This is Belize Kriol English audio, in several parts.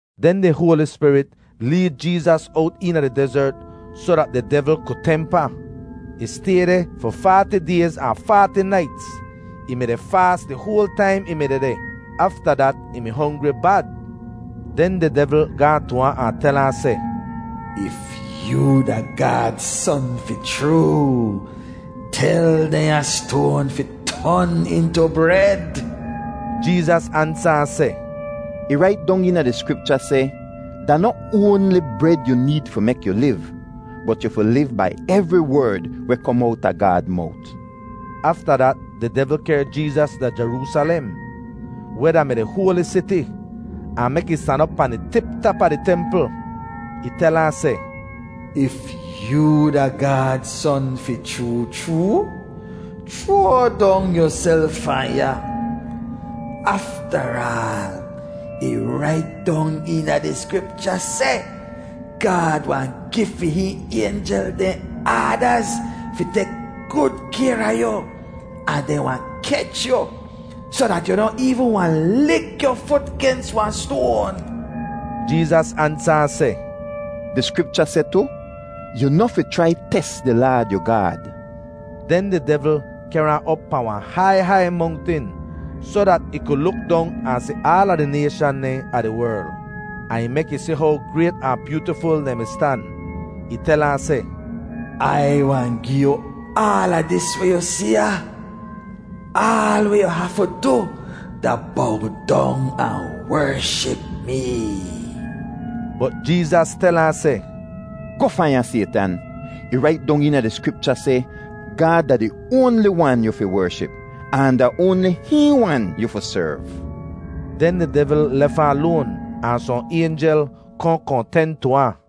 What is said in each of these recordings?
Den di Hoali Spirit leed Jeezas owt eena di dezert soh dat di devl ku temp ahn. Ih stay deh fi faati dayz ahn faati naits. Ih mi-di faas di hoal taim ih mi dehdeh. Afta dat ih mi hongri bad. Den di devl gaahn tu ahn, ahn tel ahn seh, “If yoo da Gaad Son fi chroo, tel dehnya stoan fi ton intu bred.” Jeezas ansa ahn seh, “Ih rait dong eena di Skripcha seh, ‘Da noh oanli bred yu need fi mek yu liv, bot yu fi liv bai evri werd weh kom owta Gaad mowt.’” Afta dat di devl kehr Jeezas da Jeroosalem, weh da-mi di hoali siti, ahn mek ih stan op pahn di tip tap a di templ. Ih tel ahn seh, “If yoo da Gaad Son fi chroo chroo, chroa dong yuself fahn ya. Aftaraal, ih rait dong eena di Skripcha seh, ‘Gaad wahn gi fi hihn aynjel dehn aadaz fi tek gud kayr a yu, ahn dehn wahn kech yu, soh dat yu noh eevn wahn lik yu fut gens wahn stoan.’” Jeezas ansa ahn seh, “Di Skripcha seh tu, ‘Yu noh fi chrai tes di Laad yu Gaad.’” Den di devl kehr ahn op pahn wahn hai hai mongtin soh dat ih ku luk dong ahn si aala di nayshan dehn a di werl, ahn ih mek ih si how grayt ahn byootiful dehn mi stan. Ih tel ahn seh, “Ai wahn gi yu aala dis weh yu si ya. Aal weh yu hafu du da bow dong ahn wership mee.” Bot Jeezas tel ahn seh, “Goh fahn ya, Saytan. Ih rait dong eena di Skripcha seh, ‘Gaad da di oanli wan yu fi wership, ahn da oanli hihn wan yu fi serv.’” Den di devl lef ahn loan ahn sohn aynjel kohn kohn ten tu ahn.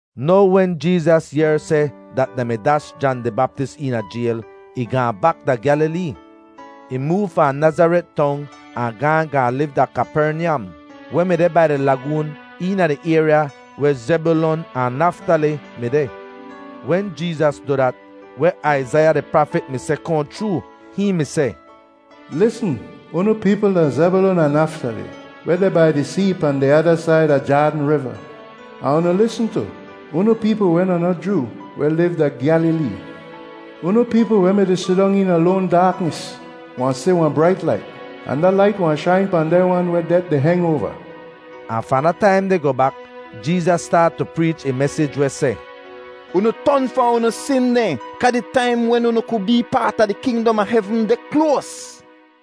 Now wen Jeezas yehr seh dat dehn mi dash Jan di Baptis eena jayl, ih gaahn bak da Gyalilee. Ih moov fahn Nazaret Tong ahn gaahn gaahn liv da Kapernyam, weh mi deh bai di lagoon eena di ayrya weh Zebyulon ahn Naftali mi deh. Wen Jeezas du dat, weh Aizaiya di prafit mi seh kohn chroo. Hihn mi seh, “Lisn, unu peepl da Zebyulon ahn Naftali, weh deh bai di see pahn di ada said a Jaadn Riva; ahn unu lisn tu, unu peepl weh da noh Joo weh liv da Gyalilee. Unu peepl weh mi-di sidong eena loan daaknis wahn si wahn brait lait; ahn da lait wahn shain pahn dehn wan weh det di heng oava.” Ahn fahn da taim deh goh bak, Jeezas staat tu preech ih mesij weh seh, “Unu ton fahn unu sin dehn kaa di taim wen unu ku bee paat a di kingdom a hevn deh kloas.”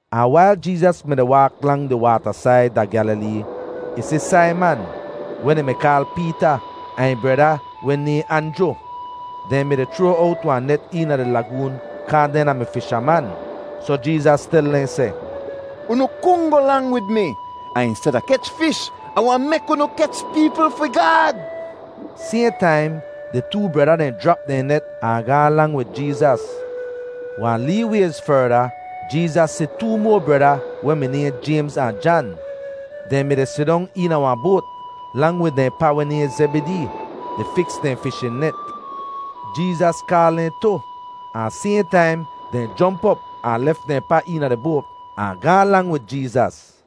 Ahn wail Jeezas mi-di waak lang di waatasaid da Gyalilee, ih si Saiman, weh dehn mi kaal Peeta, ahn ih breda weh nayhn Anjru. Dehn mi-di chroa owt wahn net eena di lagoon kaa dehn da-mi fishaman. Soh Jeezas tel dehn seh, “Unu kungoh lang wid mi, ahn insteda kech fish, Ah wahn mek unu kech peepl fi Gaad.” Sayhn taim di too breda dehn jrap dehn net ahn gaahn lang wid Jeezas. Wahn lee wayz ferda, Jeezas si too moa breda weh mi nayhn Jaymz ahn Jan. Dehn mi-di sidong eena wahn boat, lang wid dehn pa weh nayhn Zebidee, di fiks dehn fishin net. Jeezas kaal dehn tu, ahn sayhn taim dehn jomp op ahn lef dehn pa eena di boat, ahn gaahn lang wid Jeezas.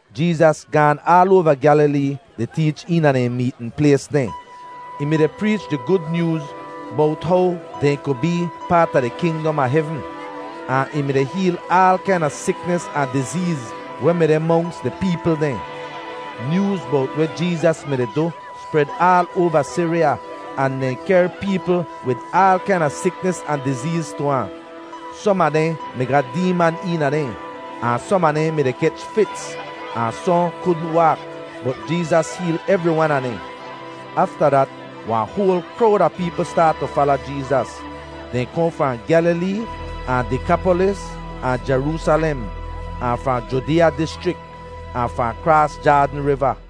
Jeezas gaan aal oava Gyalilee di teech eena dehn meetn plays dehn. Ih mi-di preech di Gud Nyooz bowt how dehn ku bee paat a di kingdom a hevn, ahn ih mi-di heel aal kaina siknis ahn dizeez weh mi deh monks di peepl dehn. Nyooz bowt weh Jeezas mi-di du spred aal oava Siriya, ahn dehn kehr peepl wid aal kaina siknis ahn dizeez tu ahn. Som a dehn mi ga deeman eena dehn, ahn som a dehn mi-di kech fits, ahn sohn kudn waak. Bot Jeezas heel evri wan a dehn. Afta dat, wahn hoal krowd a peepl staat tu fala Jeezas. Dehn kohn fahn Gyalilee ahn Dekapolis, ahn Jeroosalem, ahn fahn Judeeya dischrik, ahn fahn kraas Jaadn Riva.